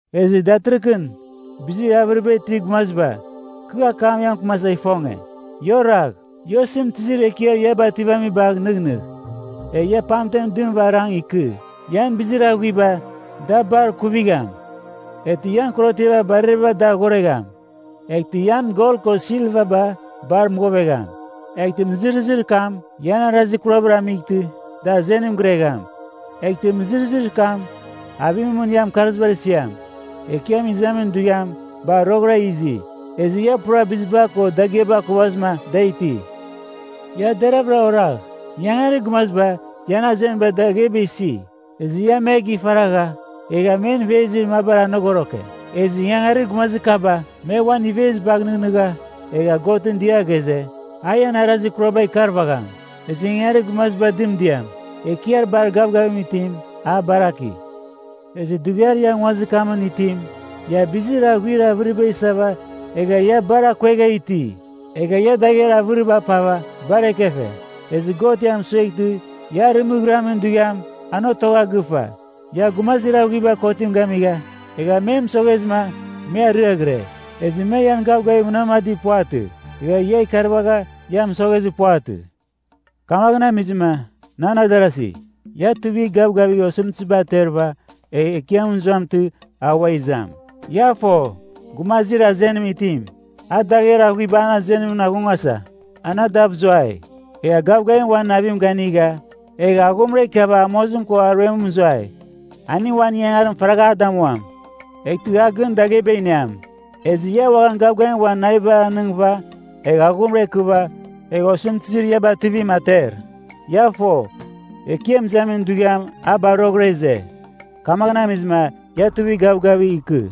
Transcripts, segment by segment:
Ezɨ datɨrɨghɨn, bizir avɨriba itir gumaziba, kɨ akam ia mɨkɨmasa ifonge. Ia oragh! Ia osɨmtɨzir ekiar ia bativamibagh nɨghnɨgh, egh ia pamtem dɨmɨva arang ikɨ. Ian bizir aghuiba da bar kuvigham. Eghtɨ ian korotiaba barareba dar ghoregham. Eghtɨ ian gol ko silvaba bar mɨghovegham, eghtɨ mɨzɨrɨzir kam ian arazir kurabar amightɨ da azenim giregham. Eghtɨ mɨzɨrɨzir kam avimɨn mɨn ian mɨkarzibar isiam. Ekiam izamin dughiam bar roghɨra izi, ezɨ ia pura biziba ko dagɨaba akuvazɨma da iti. Ia deravɨra oragh, ingangarir gumaziba ian azenibar dagheba isi, ezɨ ia me gifaragha egha men ivezir mabar anogoroke. Ezɨ ingangarir gumazir kaba me uan ivezibagh nɨghnɨgha egha Godɨn dɨa ghaze, a ian arazir kuraba ikarvagham. Ezɨ ingangarir gumazibar dɨmdiam, Ekiar Bar Gavgavim Itim, a baraki. Ezɨ dughiar ia nguazir kamɨn itim, ia bizir aghuir avɨriba isava egha ia bar akuegha iti. Egha ia dagher avɨriba apava bar ekefe. Ezɨ God ia mɨsoghtɨ ia arɨmɨghɨramin dughiam, an otogha gɨfa. Ia gumazir aghuibar kotim gamigha egha me mɨsoghezɨma me ariaghɨre. Ezɨ me ian gavgavim munamadir puvatɨ, egha ia ikarvagha ia mɨsoghezir puvatɨ. Kamaghɨn amizɨma, nan adarasi, ia tuivigh gavgavigh osɨmtɨziba aterɨva egh Ekiam mɨzuamtɨ a ua izam. Ia fo, gumazir azenim itim, a dagher aghuiba an azenimɨn aghungasa an adav zuai. Egha a gavgavim uan navim ganɨga egha aghumra ikiava amozim ko aruem mɨzuai, aning uan ingangarim faragh a damuam. Eghtɨ a gɨn dagheba iniam. Ezɨ ia uaghan gavgavim uan navibar anɨngɨva egh aghumra ikɨva egh osɨmtɨzir ia bativim ater. Ia fo, Ekiam Izamin Dughiam a bar roghɨra ize. Kamaghɨn amizɨma ia tuivigh gavgavigh ikɨ.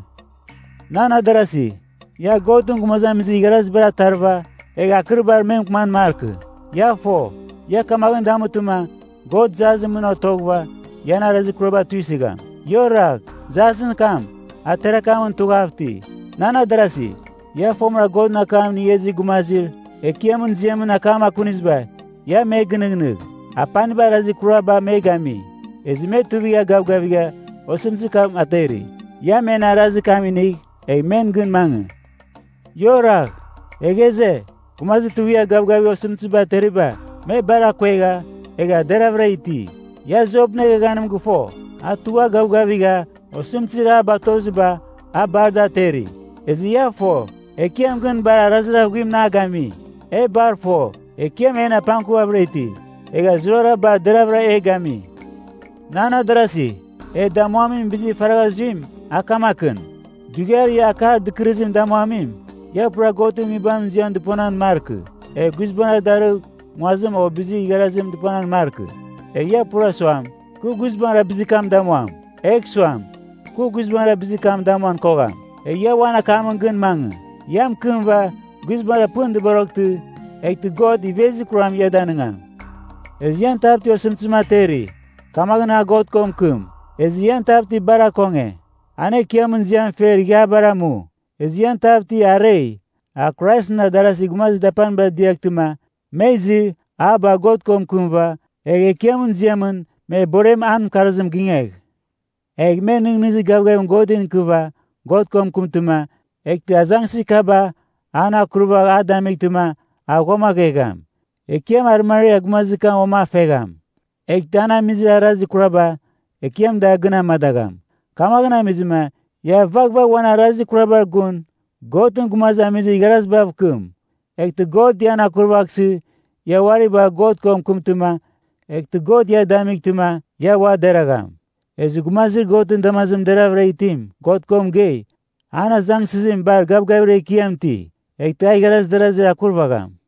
Nan adarasi, ia Godɨn gumazamizir igharazibar atarɨva egh akɨribar me mɨkɨman markɨ. Ia fo, ia kamaghɨn damutɨma, God jasɨn mɨn otoghɨva ian arazir kuraba tuisɨgham. Ia oragh, jasɨn kam a tiar akamɨn tughav iti! Nan adarasi, ia fomɨra Godɨn akam inigha izir gumazir Ekiamɨn ziamɨn akam akuniziba, ia me gɨnɨghnɨgh. Apaniba arazir kurabar me gami, ezɨ me tuivigha gavgavigha osɨmtɨzir kam ateri. Ia men arazir kam inigh, egh men gɨn mangɨ. Ia oragh. E ghaze, “Gumazir tuivigha gavgavigha osɨmtɨziba ateriba, me bar akuegha egha deravɨra iti.” Ia Jopɨn eghaghanim gɨfo, a tugha gavgavigha osɨmtɨzir a batoziba a bar da ateri. Ezɨ ia fo, Ekiam gɨn bar arazir aghuimɨn a gami. E bar fo, Ekiam en apangkuvavɨra iti, egha zurara bar deravɨra e gami. Nan adarasi, e damuamin bizir faragha zuim, a kamakɨn. Dughiar ia akar dɨkɨrɨzim damuamim, ia pura Godɨn Nguibamɨn ziam dɨponan markɨ, egh guizbangɨra darɨgh nguazim o bizir igharazim dɨponan markɨ. Egh ia pura suam, “Kɨ guizbangɨra bizir kam damuam.” Egh suam, “Kɨ guizbangɨra bizir kam damuan kogham.” Egh ia uan akamɨn gɨn mangɨ. Ia mɨkɨmɨva guizbangɨra pɨn dɨboroghtɨ, eghtɨ God ivezir kuram ia danigam. Ezɨ ian tav ti osɨmtɨzim ateri? Kamaghɨn a God ko mɨkɨm. Ezɨ ian tav ti bar akonge? An Ekiamɨn ziam fer ighiabar amu. Ezɨ ian tav ti arei? A Kraisɨn adarazir gumazir dapanibar diaghtɨma, me izɨ, a bagh God ko mɨkɨmɨva, egh Ekiamɨn ziamɨn me borem an mɨkarzim gingegh. Egh me nɨghnɨzir gavgavim Godɨn ikɨva God ko mɨkɨmtɨma, eghtɨ azangsɨzir kaba an akurvagh a damightɨma, a ghuamaghegham. Ekiam arɨmariar gumazir kam uam a fegham. Eghtɨ an amizir arazir kuraba, Ekiam da gɨn amadagham. Kamaghɨn amizɨma, ia vaghvagh uan arazir kurabar gun Godɨn gumazamizir igharazibav kɨm. Eghtɨ God ian akurvaghsɨ, ia uari bagh God ko mɨkɨmtɨma, eghtɨ God ia damightɨma ia ua deragham. Ezɨ gumazir Godɨn damazimɨn deraghavɨra itim God ko mɨgei, an azangsɨzim bar gavgavir ekiam iti, eghtɨ a igharaz darazir akurvagham.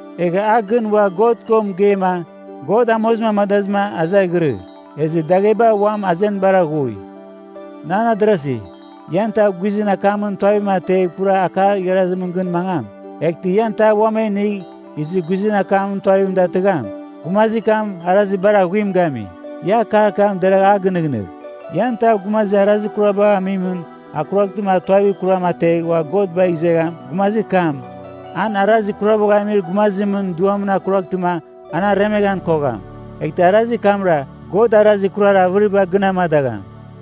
Egha a gɨn ua God ko mɨgeima, God amozim amadazɨma a zaghirɨ, ezɨ dagheba uam azenibar aghui. Nan adarasi, ian tav guizɨn akamɨn tuavim ategh pura akar igharazimɨn gɨn mangam, eghtɨ ian tav uam a inigh izɨ guizɨn akamɨn tuavim datɨgham, gumazir kam arazir bar aghuim gami. Ia akar kam deragh a gɨnɨghnɨgh! Ian tav gumazir arazir kurabagh amimɨn akuraghtɨma a tuavir kuram ategh ua God bagh izegham, gumazir kam, an arazir kurabagh amir gumazimɨn duamɨn akuraghtɨma an aremeghan kogham. Eghtɨ arazir kamra God arazir kurar avɨriba gɨn amadagham.